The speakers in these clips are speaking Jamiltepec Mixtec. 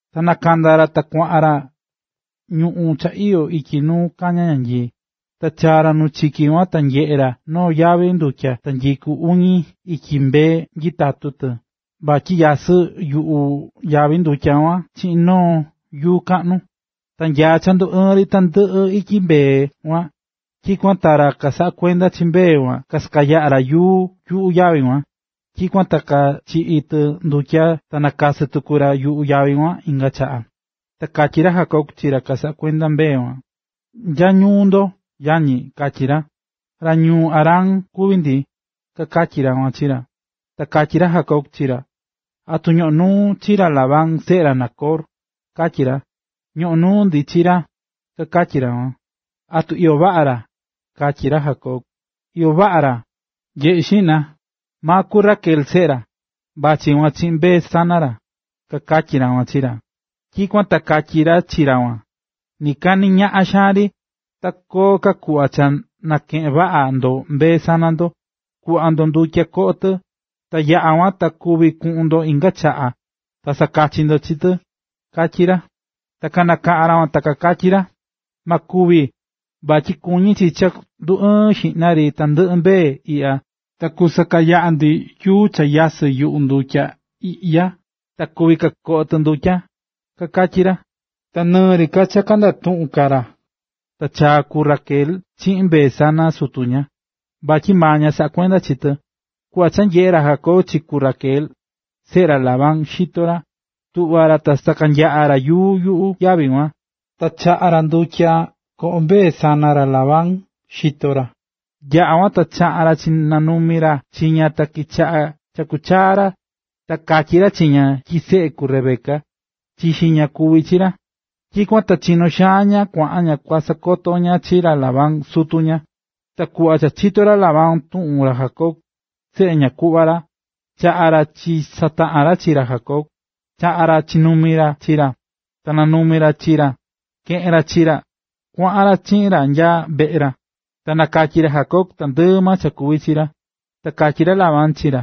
Ta nakanda̱ ra ta kuaꞌan ra ñuꞌún cha iyó ityi nu kañá ñanyii. Ta chaa̱ ra nu chiki kuan ta nyeꞌe̱ ra noo yavi ndutya ta nyikú uñi ityi mbee nyitatú tɨ vatyi nyasɨ́ yuꞌu yavi ndutya kuan chiꞌin noo yuu kaꞌnu. Ta nya cha nduɨɨn ri tandɨꞌɨ ityi mbee kuan, tyikuan ta ra kasaꞌá kuenda chi mbee kuan kasakanyaꞌá ra yuu yuꞌu yavi kuan, tyikuan ta kachiꞌí tɨ ndutya ta kanakasɨ́ tuku ra yuꞌu yavi kuan inga chaꞌa. Ta katyí ra Jacob chi ra kasaꞌá kuenda mbee kuan: ―¿Nya ñuu ndo, yañi? ―katyí ra. ―Ra ñuu Harán kuví ndi ―kakatyí ra kuan chi ra. Ta katyí ra Jacob chi ra: ―¿Atu ñoꞌón nuu ndo chi ra Labán, seꞌe ra Nacor? ―katyí ra ―Ñoꞌon nuu ndi chi ra ―kakatyí ra kuan. ―¿Atu iyó vaꞌa ra? ―katyí ra Jacob. ―Iyó vaꞌa ra. Nye̱ꞌe xiꞌna, maa ku Raquel seꞌe ra, vachí kuan chiꞌin mbee sana ra ―kakatyí ra kuan chi ra. Tyikuan ta katyi ra chi ra kuan: ―Nɨ kaa nɨ ñaꞌan xaan ri, ta koo ka kuꞌva cha nakeꞌen vaꞌa ndo mbee sana ndo. Ku̱ꞌva ndo ndutya koꞌo tɨ ta yaꞌa kuan ta kuvi kuꞌun ndo inga chaꞌa ta sakachi ndo chi tɨ ―katyí ra. Ta kanakaꞌa̱n ra kuan, ta kakatyí ra: ―Ma kuvi. Vatyi kuñí chi cha nduɨɨn xiꞌna ri tandɨꞌɨ mbee iꞌya ta kusakanyaꞌa ndi yuu cha nyasɨ́ yuꞌu ndutya iꞌya ta kuvi kakoꞌo tɨ ndutya ―kakatyí ra. Ta nɨɨ ri ka cha kandatuꞌún ka ra, ta chaa̱ ku Raquel chiꞌin mbee sana sutu ña, vatyi maa ña saꞌá kuenda chi tɨ. Kuꞌva cha nyeꞌe̱ ra Jacob chi ku Raquel, seꞌe ra Labán, xito ra, tuꞌva̱ ra ta sakanyaꞌa̱ ra yuu yuꞌu yavi kuan. Ta chaꞌa̱ ra ndutya koꞌo̱ mbee sana ra Labán, xito ra. Yaꞌa̱ kuan ta chaꞌa̱n ra chinanumi̱ ra chi ña ta kichaꞌa̱ chakú chaa ra. Ta katyí ra chi ña tyi seꞌe ku Rebeca, chixi ña, kuví chi ra. Tyikuan ta chinó xaan ña kuaꞌan ña kua sakoto ña chi ra Labán, sutu ña. Kuꞌva cha chito̱ ra Labán tuꞌun ra Jacob, seꞌe ñaꞌan kuꞌva ra, chaꞌa̱n ra chisataꞌa̱n ra chi ra Jacob, chaꞌa̱ ra nokumi chi ra, ta nanumi̱ ra chi ra, keꞌe̱n ra chi ra, kuaꞌan ra chiꞌin ra nya veꞌe ra. Ta nakatyi̱ ra Jacob tandɨꞌɨ maa cha kuvi̱ chi ra. Ta katyí ra Labán chi ra: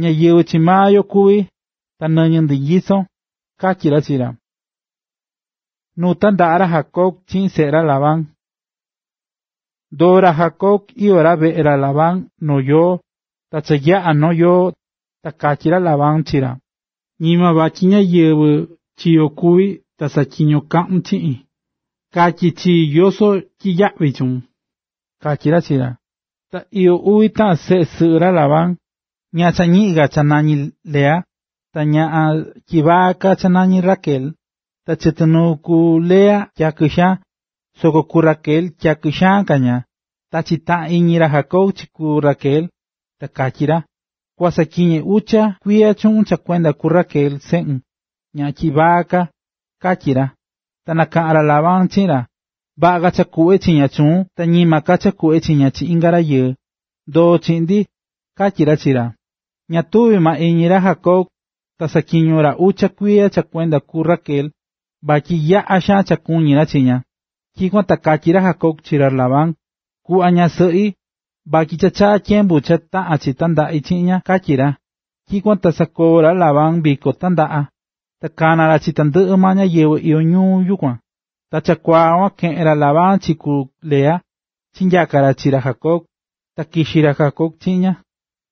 ―Ñáyɨvɨ chi maa yo kuví, ta nɨñɨ ndi nyisón ―katyí ra chi ra. Nu tandaꞌa̱ ra Jacob chiꞌin seꞌe ra Labán Ndoo̱ ra Jacob iyó ra veꞌe ra Labán noo yoo. Ta cha yaꞌa̱ noo yoo, ta katyí ra Labán chi ra: ―Ñima vatyi ñáyɨvɨ chi yo kuví ta saꞌatyiño kaꞌun chiꞌin, ka̱tyi chii yoso tyiyaꞌvi chuun ―katyí ra chi ra. Ta iyó uvi taꞌan seꞌe sɨꞌɨ ra Labán: Ñaꞌan cha ñiꞌin ka nañí ña Lea, ta ñaꞌan tyivaa ka nañí ña Raquel. Ta chɨtɨ nuu ku Lea tyakɨ xaan, soko ku Raquel tyakɨ xaan ka ña. Ta chitaꞌán iñi ra Jacob chi ku Raquel, ta katyí ra: ―Kua saꞌatyiñe ucha kuiya chuꞌun cha kuenda ku Raquel, seꞌun, ñaꞌan tyivaa ka ―katyí ra. Ta nakaꞌa̱n ra Labán chiꞌin ra: ―Vaꞌa ka cha kuꞌve chi ña chuun ta ñima ka cha kuꞌve chi ña chi inga rayɨɨ. Ndo̱o chiꞌin ―katyí ra chi ra. Ña tuvi̱ maa iñi ra Jacob, ta saꞌatyiño̱ ra ucha kuiya cha kuenda ku Raquel, vatyi yaꞌa xaan cha kuñí ra chi ña. Tyikuan ta katyí ra Jacob chi ra Labán: ―Ku̱ꞌva ñasɨꞌi vatyi cha chaa̱ tyembu cha taꞌán chi tandaꞌi chiꞌin ña ―katyí ra. Tyikuan ta sakoo̱ ra Labán viko tandaꞌa ta kana̱ ra chi tandɨꞌɨ maa ñáyɨvɨ iyó yukuan. Ta chakuaa kuan, keꞌe̱n ra Labán chi ku Lea, chinyaka̱ ra chi ra Jacob, ta kixi̱ ra Jacob chiꞌin ña.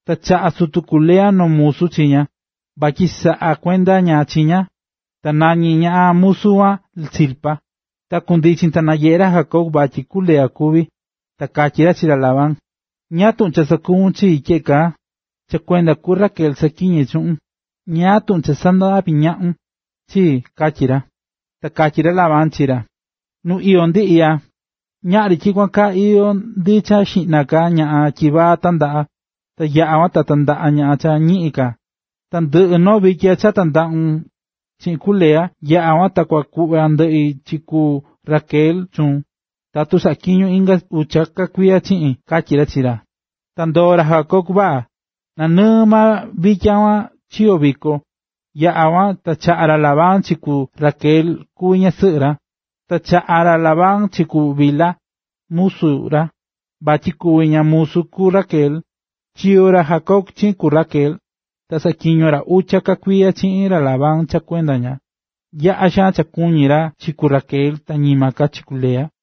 Ta chaꞌa̱ sutu ku Lea noo musu chi ña, vatyi saꞌakuenda ña chi ña, ta nañí ñaꞌan musu kuan Zilpa. Ta kundichin ta nanyeꞌe̱ ra Jacob vatyi ku Lea kuví, ta katyí ra chi ra Labán: ―¿Ñáá tuꞌun cha sakuvún chii tyeꞌe kaa? Cha kuenda ku Raquel saꞌatyiñe̱ chuꞌun. ¿Ñáá tuꞌun cha sandaꞌvi̱ ñaꞌun chii? ―katyí ra. Ta katyí ra Labán chi ra: ―Nu iyó ndi iꞌya, ñaꞌri tyikuan kaa iyó ndi cha xiꞌna ka ñaꞌan tyivaa tandaꞌa, ta yaꞌa kuan ta tandaꞌa ñaꞌan cha ñiꞌin ka. Na ndɨꞌɨ noo vitya cha tandaꞌun chiꞌin ku Lea, yaꞌa kuan ta kua kuꞌva ndɨꞌi chi ku Raquel chuun, tatu saꞌatyiñon inga ucha ka kuiya chiꞌin ―katyí ra chi ra. Ndoo̱ ra Jacob vaꞌa. Nanɨɨ maa vitya kuan chiyo̱ viko, yaꞌa̱ kuan ta chaꞌa̱ ra Labán chi ku Raquel kuvi ñasɨꞌɨ ra. Ta chaꞌa̱ ra Labán chi ku Bilha, musu ra, vatyi kuvi ña musu ku Raquel. Chiyo̱ ra Jacob chiꞌin ku Raquel, ta saꞌatyiño̱ ra ucha ka kuiya chiꞌin ra Labán cha kuenda ña. Yaꞌa̱ xaan ka kuñí ra chi ku Raquel ta ñima ka chi ku Lea.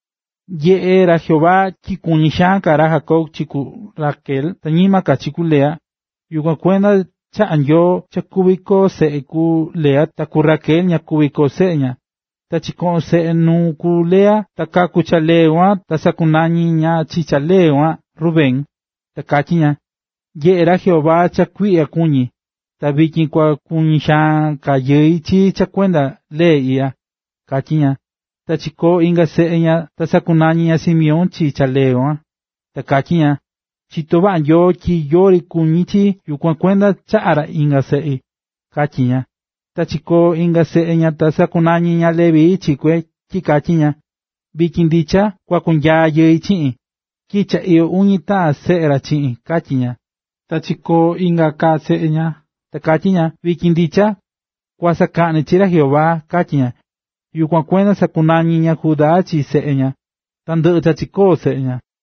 Nyeꞌé ra Jehová tyi kuñí xaan ka ra Jacob chi ku Raquel ta ñima ka chi ku Lea, yukuan kuenda chaꞌa̱ Nyoo cha kuví koo seꞌe ku Lea ta ku Raquel ña kuví koo seꞌe ña. Ta chikoꞌón seꞌe nuu ku Lea ta kaku̱ cha lee kuan ta sakunañi̱ ña chi cha lee kuan Rubén, ta katyí ña: “Nyeꞌé ra Jehová cha kuiꞌya kuñí, ta vityin kua kuñi xaan ka yɨi chii cha kuenda lee iꞌya”, katyí ña. Chikoo̱ inga seꞌe ña ta sakunañi̱ ña Simeón chi cha lee kuan, ta katyí ña: “Chitó maa Nyoo tyi yori kuñí chii, yukuan kuenda chaꞌa̱ ra inga seꞌi”, katyí ña. Ta chikoo̱ inga seꞌe ña ta sakunañi̱ ña Leví chi kue tyi katyí ña: “Vityin ndicha kua kunyaa yɨi chiꞌin, tyi cha iyó uñi taꞌan seꞌe ra chiꞌin”, katyí ña. Ta chikoo̱ inga ka seꞌe ña, ta katyí ña: “Vityin ndicha kua sakaꞌni chi ra Jehová”, katyí ña. Yukuan kuenda sakunañi̱ ña Judá chi seꞌe ña. Ta ndɨꞌɨ̱ cha chikoó seꞌe ña.